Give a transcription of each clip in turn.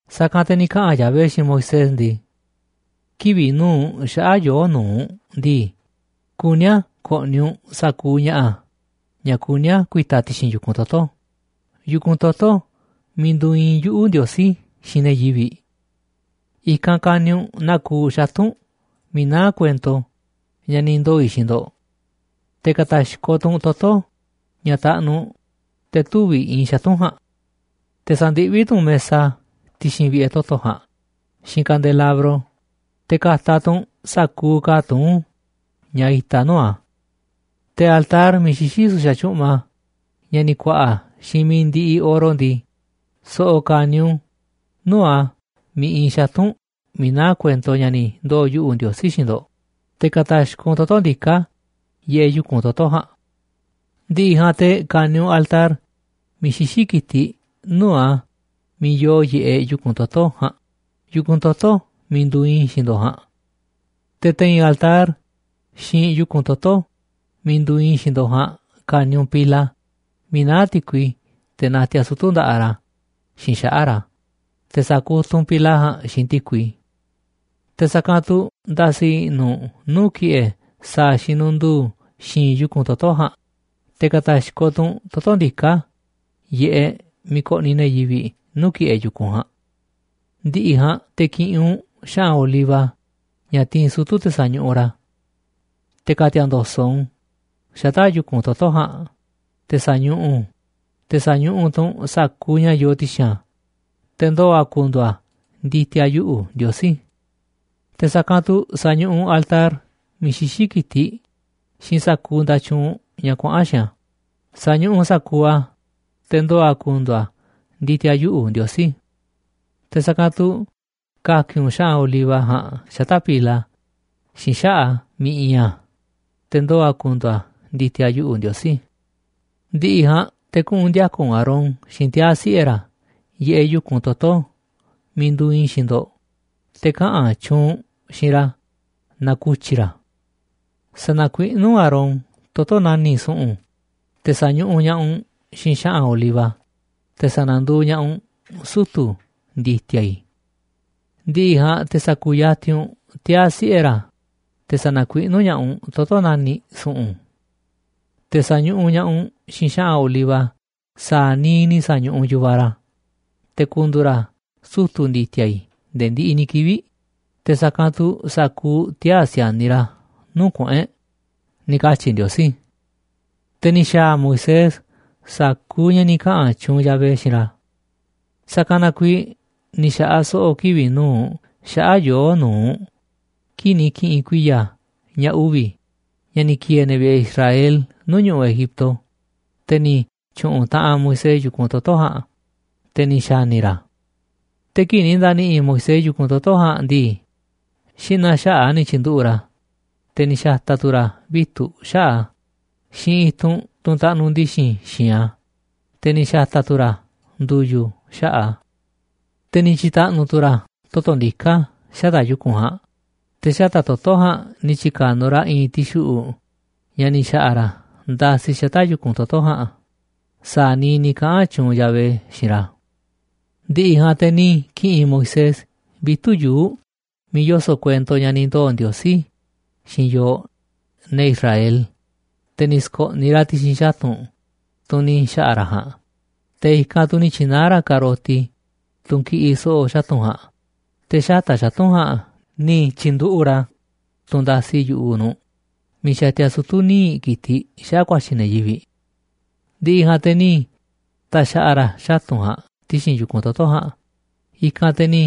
Sa̱kanꞌ te̱ ni̱ kaꞌa̱n Yahvé xiinꞌ Moisés ndii: ―Kivi̱ꞌ nu̱uꞌ xaꞌa̱ꞌ yoo̱ꞌ nu̱uꞌ ndii, kuní a̱ ko̱ꞌni̱ u̱nꞌ sa̱kuuꞌ ña̱ꞌa̱ ña̱ kuní a̱ ku̱i̱ta̱ ti̱xi̱n yu̱kunꞌ toto̱, yu̱kunꞌ toto̱ miiꞌ nduuꞌ iinꞌ yuꞌu̱, Ndiosí, xiinꞌ ne̱ yivi̱ꞌ. I̱kanꞌ ka̱ni̱ u̱nꞌ naa kuuꞌ xatu̱nꞌ miiꞌ naá kuento ña̱ ni̱ ndoo̱ i̱ xiinꞌ ndo̱ꞌ. Te̱ ka̱ta̱xkoꞌ tu̱ u̱nꞌ toto̱ ña̱ taꞌnuꞌ te̱ tüviꞌ iinꞌ xatu̱nꞌ ja̱a̱nꞌ. Te̱ sa̱ndiꞌví tu̱ u̱nꞌ mesa ti̱xi̱n vi̱ꞌe̱ toto̱ ja̱a̱nꞌ xiinꞌ kandelabro, te̱ ka̱ta̱ tu̱ u̱nꞌ sa̱kuuꞌ ka̱a̱ tuún ña̱ itaꞌ nuu̱ꞌ a̱. Te̱ altar miiꞌ xixí su̱xa̱ tyu̱ꞌma, ña̱ ni̱ ku̱a̱ꞌa̱ xiinꞌ mi̱iꞌ ndiꞌiꞌ oro ndii, so̱ꞌo̱ ka̱ni̱ u̱nꞌ u̱n nuu̱ꞌ a̱ miiꞌ iinꞌ xatu̱nꞌ miiꞌ naá kuento ña̱ ni̱ ndoo̱ yuꞌu̱ꞌ, Ndiosí, xiinꞌ ndo̱ꞌ, te̱ ka̱ta̱xkoꞌ u̱nꞌ toto̱ ndiká yiꞌeꞌ yu̱kunꞌ toto̱ ja̱a̱nꞌ. Ndi̱ꞌi̱ ja̱a̱nꞌ te̱ ka̱ni̱ u̱nꞌ altar miiꞌ xixí ki̱tiꞌ nuu̱ꞌ a̱ miiꞌ yoo yiꞌeꞌ yu̱kunꞌ toto̱ ja̱a̱nꞌ, yu̱kunꞌ toto̱ miiꞌ nduuꞌ iinꞌ i̱ xiinꞌ ndo̱ꞌ ja̱a̱nꞌ. Te̱ te̱i̱n altar xiinꞌ yu̱kunꞌ toto̱ miiꞌ nduuꞌ iinꞌ i̱ xiinꞌ ndo̱ꞌ ja̱a̱nꞌ ka̱ni̱ u̱nꞌ pila miiꞌ naá ti̱kui teꞌ natiaꞌ sutu̱ nda̱ꞌaꞌ ra̱ xiinꞌ xaꞌa̱ꞌ ra̱, te̱ sa̱kutuꞌ u̱nꞌ pila ja̱a̱nꞌ xiinꞌ ti̱kui. Te̱ sa̱kanꞌ tu̱ nda̱si̱ i̱ꞌnu̱ u̱nꞌ nuu̱ꞌ ki̱ꞌe̱ sa̱a̱ xinunduu xi̱i̱nꞌ yu̱kunꞌ toto̱ ja̱a̱nꞌ, te̱ ka̱ta̱xkoꞌ tu̱ u̱nꞌ toto̱ ndiká yiꞌeꞌ miiꞌ koꞌniꞌ ne̱ yivi̱ꞌ nuu̱ꞌ ki̱ꞌe̱ yu̱kunꞌ ja̱a̱nꞌ. ’Ndi̱ꞌi̱ ja̱a̱nꞌ te̱ ki̱ꞌi̱n u̱nꞌ xa̱ꞌa̱n oliva ña̱ tiinꞌ sutu̱ te̱ sañuꞌuꞌ ra̱, te̱ ka̱ti̱a̱ ndo̱so̱ꞌ u̱nꞌ u̱n xata̱ꞌ yu̱kunꞌ toto̱ ja̱a̱nꞌ te̱ sa̱ñuꞌuꞌ u̱nꞌ, te̱ sa̱ñuꞌuꞌ tu̱ u̱nꞌ sa̱kuuꞌ ña̱ yoo ti̱xi̱n a̱, te̱ ndoo̱ a̱ ku̱ndu̱u̱ a̱ ndi̱ti̱a̱ yuꞌu̱, Ndiosí. Te̱ sa̱kanꞌ tu̱ sa̱ñuꞌuꞌ u̱nꞌ altar miiꞌ xixí ki̱tiꞌ xiinꞌ sa̱kuuꞌ nda̱tyuunꞌ ña̱ kuaꞌa̱n xiinꞌ a̱, sa̱ñuꞌuꞌ u̱nꞌ sa̱kuuꞌ a̱, te̱ ndoo̱ a̱ ku̱ndu̱u̱ a̱ ndi̱ti̱a̱ yuꞌu̱, Ndiosí. Te̱ sa̱kanꞌ tu̱ ka̱ki̱n u̱nꞌ xa̱ꞌa̱n oliva ja̱a̱nꞌ xata̱ꞌ pila xiinꞌ xaꞌa̱ꞌ a̱ miiꞌ iinꞌ a̱, te̱ ndoo̱ a̱ ku̱ndu̱u̱ a̱ ndi̱ti̱a̱ yuꞌu̱, Ndiosí. ’Ndi̱ꞌi̱ ja̱a̱nꞌ te̱ kuꞌu̱n ndi̱a̱ka̱ u̱nꞌ Aarón xiinꞌ tiaa̱ siꞌe̱ ra̱ yiꞌeꞌ yu̱kunꞌ toto̱ miiꞌ nduuꞌ iinꞌ i̱ xiinꞌ ndo̱ꞌ, te̱ kaꞌa̱n tyuunꞌ u̱nꞌ xiinꞌ ra̱ na ku̱tyi̱ ra̱. Sa̱na̱kuiꞌnú u̱nꞌ Aarón toto̱ nani̱ꞌ su̱ꞌu̱n, te̱ sa̱ñuꞌuꞌ ña̱ꞌaꞌ u̱nꞌ xiinꞌ xa̱ꞌa̱n oliva, te̱ sa̱na̱nduuꞌ ña̱ꞌaꞌ u̱nꞌ sutu̱ ndi̱ti̱a̱ i̱. Ndi̱ꞌi̱ ja̱a̱nꞌ te̱ sa̱ku̱yatinꞌ u̱nꞌ tiaa̱ siꞌe̱ ra̱, te̱ sa̱na̱kuiꞌnú ña̱ꞌaꞌ u̱nꞌ toto̱ nani̱ꞌ su̱ꞌu̱n. Te̱ sa̱ñuꞌuꞌ ña̱ꞌaꞌ u̱nꞌ xiinꞌ xa̱ꞌa̱n oliva sa̱a̱ niiꞌ ni̱ sa̱ñuꞌuꞌ u̱nꞌ yu̱vaꞌ ra̱, te̱ ku̱ndu̱u̱ ra̱ sutu̱ ndi̱ti̱a̱ i̱ nde̱e̱ ndiꞌiꞌ ni̱ kivi̱ꞌ, te̱ sa̱kanꞌ tu̱ sa̱kuuꞌ tiaa̱ si̱a̱niꞌ ra̱ nuu̱ꞌ kuꞌu̱n e̱ꞌ ―ni̱ katyi̱ Ndiosí. Te̱ ni̱ xa̱a̱ Moisés sa̱kuuꞌ ña̱ ni̱ kaꞌa̱n tyuunꞌ Yahvé xiinꞌ ra̱. Sa̱kanꞌ na kuiiꞌ ni̱ xa̱ꞌaꞌ so̱ꞌo̱ kivi̱ꞌ nu̱uꞌ xaꞌa̱ꞌ yoo̱ꞌ nu̱uꞌ kii̱ꞌ ni̱ ki̱ꞌi̱n kuiya̱ ña̱ uvi̱ ña̱ ni̱ ki̱e̱e̱ ne̱ vi̱ꞌe̱ Israel nuu̱ꞌ ñu̱ꞌuꞌ Egipto, te̱ ni̱ tyu̱ꞌu̱n taꞌanꞌ Moisés yu̱kunꞌ toto̱ ja̱a̱nꞌ, te̱ ni̱ xa̱ni̱ ra̱ a̱. Te̱ kii̱ꞌ ni̱ nda̱ni̱ꞌi̱ Moisés yu̱kunꞌ toto̱ ja̱a̱nꞌ ndii, xi̱ꞌna̱ xaꞌa̱ꞌ a̱ ni̱ tyi̱nduꞌu̱ꞌ ra̱, te̱ ni̱ xa̱ta̱ tu̱ ra̱ vitu̱ꞌ xaꞌa̱ꞌ a̱ xiinꞌ i̱tunꞌ, tunꞌ taꞌnuꞌ ndi̱xi̱n xi̱i̱nꞌ a̱, te̱ ni̱ xa̱ta̱ tu̱ ra̱ ndu̱yu̱ xaꞌa̱ꞌ a̱. Te̱ ni̱ tyi̱ka̱nuꞌ tu̱ ra̱ toto̱ ndiká xata̱ꞌ yu̱kunꞌ ja̱a̱nꞌ, te̱ xata̱ꞌ toto̱ ja̱a̱nꞌ ni̱ tyi̱ka̱nuꞌ ra̱ i̱i̱nꞌ ti̱xuꞌu̱ꞌ ña̱ ni̱ xa̱ꞌa̱ ra̱ ndasi xata̱ꞌ yu̱kunꞌ toto̱ ja̱a̱nꞌ sa̱a̱ niiꞌ ni̱ kaꞌa̱n tyuunꞌ Yahvé xiinꞌ ra̱. Ndi̱ꞌi̱ ja̱a̱nꞌ te̱ ni̱ ki̱ꞌi̱n Moisés vitu̱ꞌ yuu̱ꞌ miiꞌ yoso̱ꞌ kuento ña̱ ni̱ ndoo̱ Ndiosí xiinꞌ yooꞌ, ne̱ Israel, te̱ ni̱ sko̱ꞌniꞌ ra̱ ti̱xi̱n xatu̱nꞌ, tunꞌ ni̱ xa̱ꞌa̱ ra̱ ja̱a̱nꞌ. Te̱ i̱kanꞌ tu̱ ni̱ tyi̱naá ra̱ ka̱roti, tunꞌ kiꞌiꞌ so̱ꞌo̱ xatu̱nꞌ ja̱a̱nꞌ, te̱ xata̱ꞌ xatu̱nꞌ ja̱a̱nꞌ ni̱ tyi̱nduꞌu̱ꞌ ra̱ tunꞌ ndasi yu̱ꞌuꞌ nu̱ꞌ miiꞌ xatia sutu̱ níiꞌ ki̱tiꞌ xaꞌa̱ ku̱a̱tyi̱ ne̱ yivi̱ꞌ. Ndi̱ꞌi̱ ja̱a̱nꞌ te̱ ni̱ ta̱xa̱ꞌa̱ ra̱ xatu̱nꞌ ja̱a̱nꞌ ti̱xi̱n yu̱kunꞌ toto̱ ja̱a̱nꞌ. I̱kanꞌ te̱ ni̱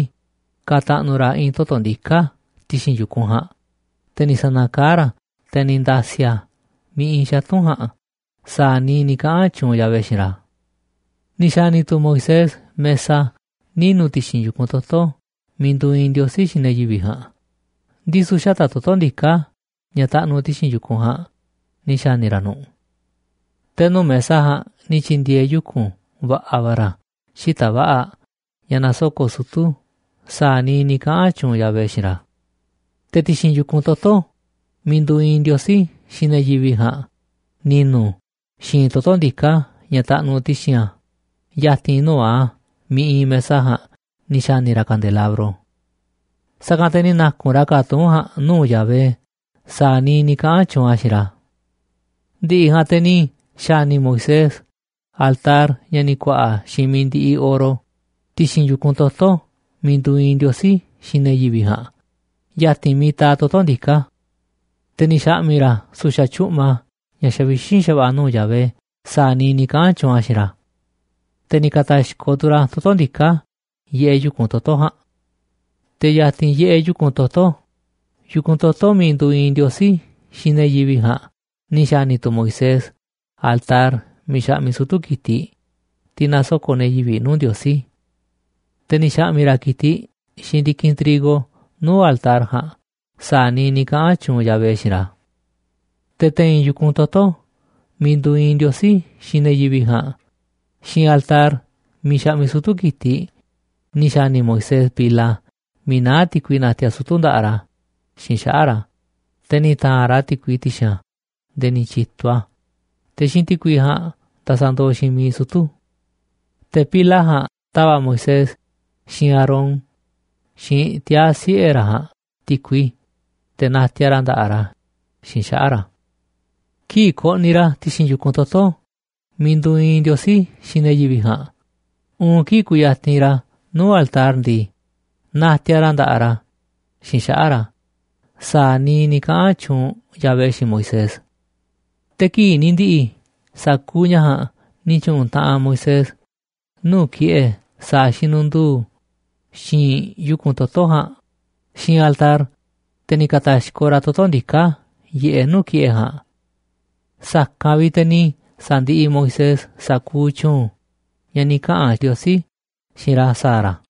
ka̱ta̱ꞌnu̱ ra̱ i̱i̱n toto̱ ndiká ti̱xi̱n yu̱kunꞌ ja̱a̱nꞌ, te̱ ni̱ sa̱na̱kaá ra̱ a̱, te̱ ni̱ nda̱si̱ a̱ miiꞌ iinꞌ xatu̱nꞌ ja̱a̱nꞌ sa̱a̱ niiꞌ ni̱ kaꞌa̱n tyuunꞌ Yahvé xiinꞌ ra̱. Ni̱ xa̱ni̱ tu̱ Moisés mesa ninu̱ ti̱xi̱n yu̱kunꞌ toto̱ miiꞌ nduuꞌ iinꞌ Ndiosí xiinꞌ ne̱ yivi̱ꞌ ja̱a̱nꞌ, ndisu̱ xata̱ꞌ toto̱ ndiká ña̱ taꞌnuꞌ ti̱xi̱n yu̱kunꞌ ja̱a̱nꞌ ni̱ xa̱ni̱ ra̱ nu̱ꞌ. Te̱ nuu̱ꞌ mesa ja̱a̱nꞌ ni̱ tyi̱ndi̱e̱e̱ yuku̱n va̱ꞌa̱ va̱ ra̱ xita̱ꞌ va̱ꞌa̱ ña̱ nasoko̱ꞌ sutu̱ sa̱a̱ niiꞌ ni̱ kaꞌa̱n tyuunꞌ Yahvé xiinꞌ ra̱. Te̱ ti̱xi̱n yu̱kunꞌ toto̱ miiꞌ nduuꞌ iinꞌ Ndiosí xiinꞌ ne̱ yivi̱ꞌ ja̱a̱nꞌ ni̱nu̱ xi̱i̱nꞌ toto̱ ndiká ña̱ taꞌnuꞌ ti̱xi̱n a̱ ya̱ti̱n nuu̱ꞌ a̱ miiꞌ iinꞌ mesa ja̱a̱nꞌ ni̱ xa̱ni̱ ra̱ kandelabro. Sa̱kanꞌ te̱ ni̱ na̱ku̱nꞌ ra̱ ka̱a̱ tuún ja̱a̱nꞌ nuu̱ꞌ Yahvé sa̱a̱ niiꞌ ni̱ kaꞌa̱n tyuunꞌ a̱ xiinꞌ ra̱. Ndi̱ꞌi̱ ja̱a̱nꞌ te̱ ni̱ xa̱ni̱ Moisés altar ña̱ ni̱ ku̱a̱ꞌa̱ xiinꞌ mi̱iꞌ ndi̱ꞌi̱ oro ti̱xi̱n yu̱kunꞌ toto̱ miiꞌ nduuꞌ iinꞌ Ndiosí xiinꞌ ne̱ yivi̱ꞌ ja̱a̱nꞌ ya̱ti̱n miiꞌ taaꞌ toto̱ ndiká. Te̱ ni̱ xa̱ꞌmi̱ ra̱ su̱xa̱ tyu̱ꞌma ña̱ xavixínꞌ xa̱va̱ꞌa̱ nuu̱ꞌ Yahvé sa̱a̱ niiꞌ ni̱ kaꞌa̱n tyuunꞌ a̱ xiinꞌ ra̱. Te̱ ni̱ ka̱ta̱xkoꞌ tu̱ ra̱ toto̱ ndiká yiꞌeꞌ yu̱kunꞌ toto̱ ja̱a̱nꞌ. Te̱ ya̱ti̱n yiꞌeꞌ yu̱kunꞌ toto̱, yu̱kunꞌ toto̱ miiꞌ nduuꞌ iinꞌ Ndiosí xiinꞌ ne̱ yivi̱ꞌ ja̱a̱nꞌ, ni̱ xa̱ni̱ tu̱ Moisés altar miiꞌ xaꞌmiꞌ sutu̱ ki̱tiꞌ, tiꞌ nasoko̱ꞌ ne̱ yivi̱ꞌ nuu̱ꞌ Ndiosí. Te̱ ni̱ xa̱ꞌmi̱ ra̱ ki̱tiꞌ xiinꞌ ndi̱kinꞌ trigo nuu̱ꞌ altar ja̱a̱nꞌ sa̱a̱ niiꞌ ni̱ kaꞌa̱n tyuunꞌ Yahvé xiinꞌ ra̱. Te̱ te̱i̱n yu̱kunꞌ toto̱ miiꞌ nduuꞌ iinꞌ Ndiosí xiinꞌ ne̱ yivi̱ꞌ ja̱a̱nꞌ xiinꞌ altar miiꞌ xaꞌmiꞌ sutu̱ ki̱tiꞌ, ni̱ xa̱ni̱ Moisés pila miiꞌ naá ti̱kui natiaꞌ sutu̱ nda̱ꞌaꞌ ra̱ xiinꞌ xaꞌa̱ꞌ ra̱, te̱ ni̱ ta̱a̱nꞌ ra̱ ti̱kui ti̱xi̱n a̱ nde̱e̱ ni̱ tyi̱tuꞌ a̱, te̱ xiinꞌ ti̱kui ja̱a̱nꞌ ndasandooꞌ xiinꞌ miiꞌ sutu̱. Te̱ pila ja̱a̱nꞌ tava̱ꞌ Moisés, xiinꞌ Aarón, xiinꞌ tiaa̱ siꞌe̱ ra̱ ja̱a̱nꞌ ti̱kui, te̱ natiaꞌ ra̱ nda̱ꞌaꞌ ra̱ xiinꞌ xaꞌa̱ꞌ ra̱. Kii̱ꞌ koꞌniꞌ ra̱ ti̱xi̱n yu̱kunꞌ toto̱ miiꞌ nduuꞌ iinꞌ Ndiosí xiinꞌ ne̱ yivi̱ꞌ ja̱a̱nꞌ, uun kii̱ꞌ kuyatinꞌ ra̱ nuu̱ꞌ altar ndii, natiaꞌ ra̱ nda̱ꞌaꞌ ra̱ xiinꞌ xaꞌa̱ꞌ ra̱ sa̱a̱ niiꞌ ni̱ kaꞌa̱n tyuunꞌ Yahvé xiinꞌ Moisés. Te̱ kii̱ꞌ ni̱ ndi̱ꞌi̱ sa̱kuuꞌ ña̱ ja̱a̱nꞌ ni̱ tyu̱ꞌu̱n taꞌanꞌ Moisés nuu̱ꞌ ki̱ꞌe̱ sa̱a̱ xinunduu xi̱i̱nꞌ yu̱kunꞌ toto̱ ja̱a̱nꞌ xiinꞌ altar, te̱ ni̱ ka̱ta̱xkoꞌ ra̱ toto̱ ndiká yiꞌeꞌ nuu̱ꞌ ki̱ꞌe̱ ja̱a̱nꞌ. Sa̱kanꞌ vi̱ꞌ te̱ ni̱ sa̱ndiꞌiꞌ Moisés sa̱kuuꞌ tyu̱u̱n ña̱ ni̱ kaꞌa̱n Ndiosí xiinꞌ ra̱ sa̱a̱ ra̱.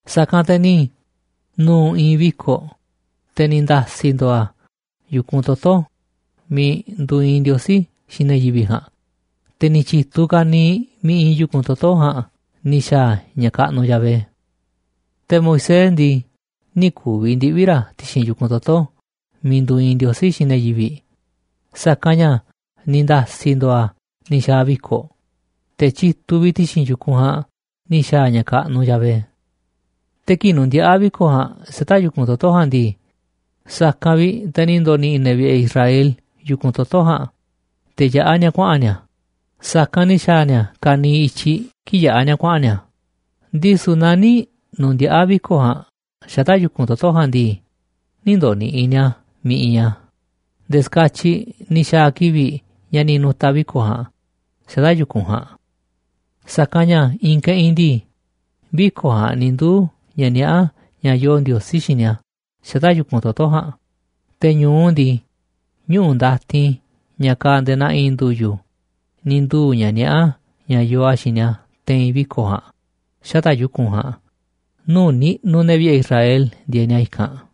Sa̱kanꞌ te̱ ni̱ nu̱u̱ i̱i̱n viko̱ꞌ, te̱ ni̱ nda̱si̱ ndo̱o̱ a̱ yu̱kunꞌ toto̱ miiꞌ nduuꞌ iinꞌ Ndiosí xiinꞌ ne̱ yivi̱ꞌ ja̱a̱nꞌ, te̱ ni̱ tyi̱tuꞌ ka̱niiꞌ miiꞌ iinꞌ yu̱kunꞌ toto̱ ja̱a̱nꞌ ni̱ xa̱a̱ ña̱ kaꞌnuꞌ Yahvé. Te̱ Moisés ndii, nï̱ ku̱vi̱ ndiꞌvi̱ ra̱ ti̱xi̱n yu̱kunꞌ toto̱ miiꞌ nduuꞌ iinꞌ Ndiosí xiinꞌ ne̱ yivi̱ꞌ, sa̱kanꞌ ña̱ ni̱ nda̱si̱ ndo̱o̱ a̱ ni̱ xa̱a̱ viko̱ꞌ, te̱ tyituꞌ vi̱ꞌ ti̱xi̱n yu̱kunꞌ ja̱a̱nꞌ ni̱ xa̱a̱ ña̱ kaꞌnuꞌ Yahvé. Te̱ kii̱ꞌ nundiaꞌá viko̱ꞌ ja̱a̱nꞌ xata̱ꞌ yu̱kunꞌ toto̱ ja̱a̱nꞌ ndii, sa̱kanꞌ vi̱ꞌ te̱ ni̱ ndo̱ni̱ꞌi̱ ne̱ vi̱ꞌe̱ Israel yu̱kunꞌ toto̱ ja̱a̱nꞌ te̱ yaꞌá ni̱a̱ kuaꞌa̱n ni̱a̱. Sa̱kanꞌ ni̱ xa̱a̱ ni̱a̱ ka̱niiꞌ i̱tyiꞌ kii̱ꞌ yaꞌá ni̱a̱ kuaꞌa̱n ni̱a̱. Ndisu̱ naaꞌ nï̱ nu̱ndiaꞌa̱ viko̱ꞌ ja̱a̱nꞌ xata̱ꞌ yu̱kunꞌ toto̱ ja̱a̱nꞌ ndii, nï̱ ndo̱ꞌni̱ꞌi̱ ni̱a̱ a̱ miiꞌ iinꞌ a̱ nde̱e̱ ska̱tyiꞌ ni̱ xa̱a̱ kivi̱ꞌ ña̱ ni̱ nu̱ta̱ viko̱ꞌ ja̱a̱nꞌ xata̱ꞌ yu̱kunꞌ ja̱a̱nꞌ. Sa̱kanꞌ ña̱ i̱i̱n keꞌinꞌ ndii, viko̱ꞌ ja̱a̱nꞌ ni̱ nduuꞌ ña̱ niaꞌá ña̱ yoo Ndiosí xiinꞌ ni̱a̱ xata̱ꞌ yu̱kunꞌ toto̱ ja̱a̱nꞌ, te̱ ñu̱u ndii, ñuꞌu̱ ndatin ña̱ kaaꞌ nde̱e̱ naa i̱i̱n ndu̱yu̱ ni̱ nduu̱ ña̱ niaꞌá ña̱ yoo a̱ xiinꞌ ni̱a̱ te̱i̱n viko̱ꞌ ja̱a̱nꞌ xata̱ꞌ yu̱kunꞌ ja̱a̱nꞌ, nuu̱ꞌ niꞌnuꞌ ne̱ vi̱ꞌe̱ Israel ndieeꞌ ni̱a̱ i̱kanꞌ.